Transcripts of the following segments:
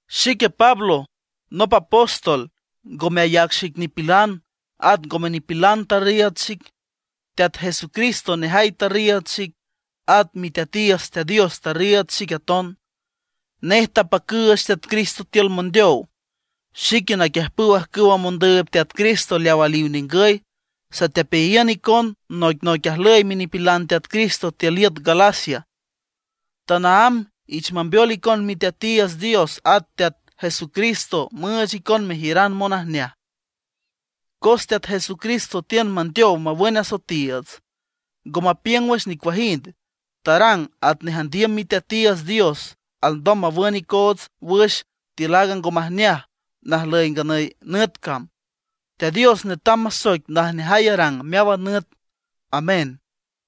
Xique Pablo nop apóstol, ngome ayac xic nipilan, at ngome nipilan tarriiüd xic. Teat Jesucristo nejay tarriiüd xic, at miteatiiüts Teat Dios tarriiüd xic aton. Nej tapacüüch Teat Cristo tiül mondeow. Xique naquiüjpüw ajcüw mondüüb Teat Cristo leaw aliw ningüy, satepeayiün icon noicnoic ajlüy minipilan Teat Cristo tiül iüt Galacia. Tanaámb ich mambeol icon Miteatiiüts Dios at Teat Jesucristo müüch icon mejiüran monajneaj. Cos Teat Jesucristo tiün mandeow mawün asoetiiüts, ngo mapiüng wüx nicuajind, tarang atnej andiüm Miteatiiüts Dios alndom mawün icoots wüx tiül aaga ngo majneaj najlüy nganüy nüt cam. Teat Dios netam masoic najneajay arang meáwan nüt. ¡Amén!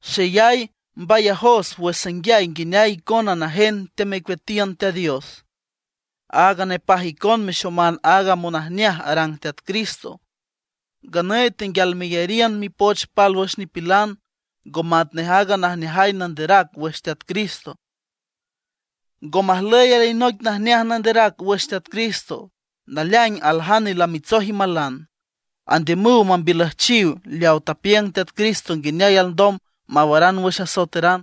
Xeyay mbayajos wüx sanguiay nguineay icona najen teamecueatiün Teat Dios, aaga nepaj icon mexoman aaga monajneaj arang Teat Cristo. Nganüy tenguial meyariün mipoch pálwüx nipilan, ngo matnej aaga najneaj nanderac wüx Teat Cristo. Ngo majlüy alinoic najneaj nanderac wüx Teat Cristo. Naleaing aljane lamitsoj imalan, andiümüw mambiülüjchiw leaw tapiüng Teat Cristo nguineay alndom mawaran wüx asoeteran.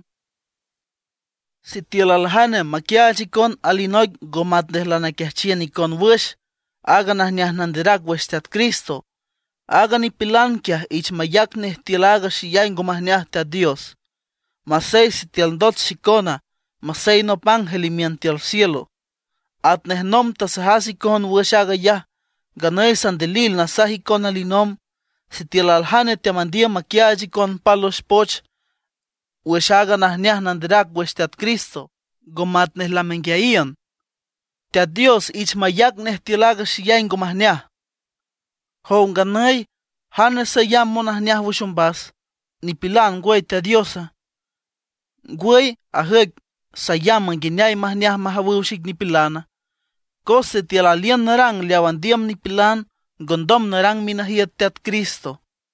Sitiül aljane maquiaach icon alinoic ngo matnej lanaquiajchiün icon wüx aaga najneaj nanderac wüx Teat Cristo, aaga nipilan quiaj ich mayac nej tiül aaga xeyay ngo majneaj Teat Dios; masey sitiül ndot xicona, masey nop ángel imiün tiül cielo. Atnej nomb tasajas icon wüx aag ayaj, nganüy sandilil nasaj icon alinomb: Sitiül aljane teamandiüm maquiaach icon pálwüx poch wüx aaga najneaj nanderac wüx Teat Cristo, ngo matnej lamenguiayiün, ¡ich mayac tiül aaga xeyay ngo majneaj Teat Dios! Jow nganüy, ¿jane sayamb monajneaj wüx ombas? ¿Nipilan, ngwüy Teat Diosa? ¿Ngwüy ajüic sayamb nguineay majneaj majawüw xic nipilana? Cos sitiül aliün narang leaw andiüm nipilan ngondom narang minajiüt Teat Cristo.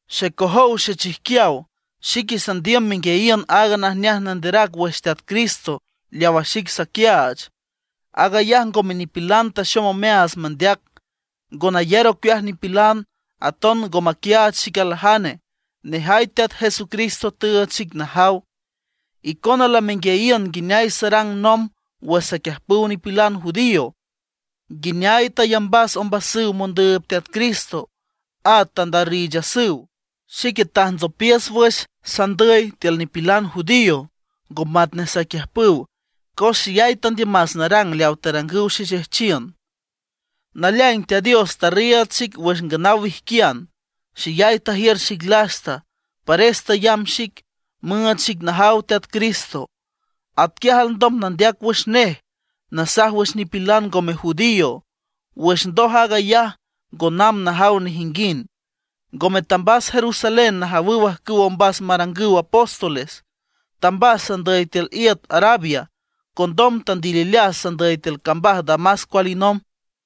Xecojow xechijquiaw, xique sandiüm menguiayiün aaga najneaj nanderac wüx Teat Cristo leawa xic saquiaach, aag ayaj ngome nipilan taxom omeaats mandeac. Ngo nayar ocueaj nipilan, aton ngo maquiaach xic aljane; nejay Teat Jesucristo tüüch xic najaw. Icona lamenguiayiün nguineay sarang nomb wüx saquiüjpüw nipilan judío, nguineay tayambas ombasüw mondüüb Teat Cristo, at tandarriichasüw. Xique tajntsopiüs wüx sandüy tiül nipilan judío, ngo matnej saquiüjpüw, cos xeyay tandiümas narang leaw tarangüw xexejchiün. Naleaing Teat Dios tarriiüd xic wüx nganaw wijquian; xeyay tajiür xic lasta, pares tayamb xic, müüch xic najaw Teat Cristo. Atquiaj alndom nandeac wüx nej nasaj wüx nipilan ngome judío. Wüx ndoj aag ayaj ngo namb najaw nejinguind. Ngome tambas Jerusalén najawüw ajcüw ombas marangüw apóstoles; tambas sandüy tiül iüt Arabia; condom tandilileas sandüy tiül cambaj Damasco alinomb.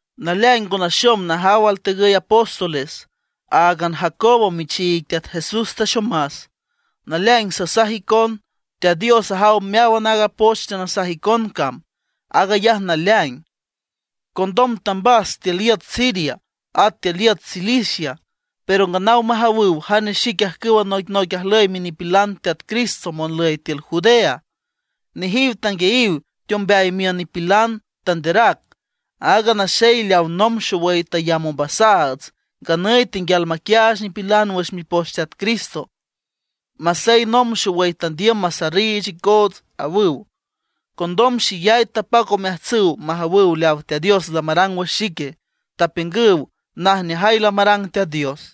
Naleaing ngo naxom najaw altegüy apóstoles; áagan Jacobo michiig Teat Jesús taxomas. Naleaing sasaj icon, Teat Dios ajaw meáwan aaga poch teanasaj icon cam, aag ayaj naleaing. Condom tambas tiül iüt Siria at tiül iüt Cilicia. Pero nganaw majawüw jane xic ajcüw noicnoic ajlüy minipilan Teat Cristo monlüy tiül Judea. Nejiw tanguiayiw teombeay miün nipilan, tanderac: “Aaga naxey leaw nomb xowüy tayamb ombasaats, nganüy tenguial maquiaach nipilan wüx mipoch Teat Cristo, masey nomb xowüy tandiüm masarriich icoots”, awüw. Condom xeyay tapac omeajtsüw majawüw leaw Teat Dios lamarang wüx xique, tapiüngüw najneajay lamarang Teat Dios.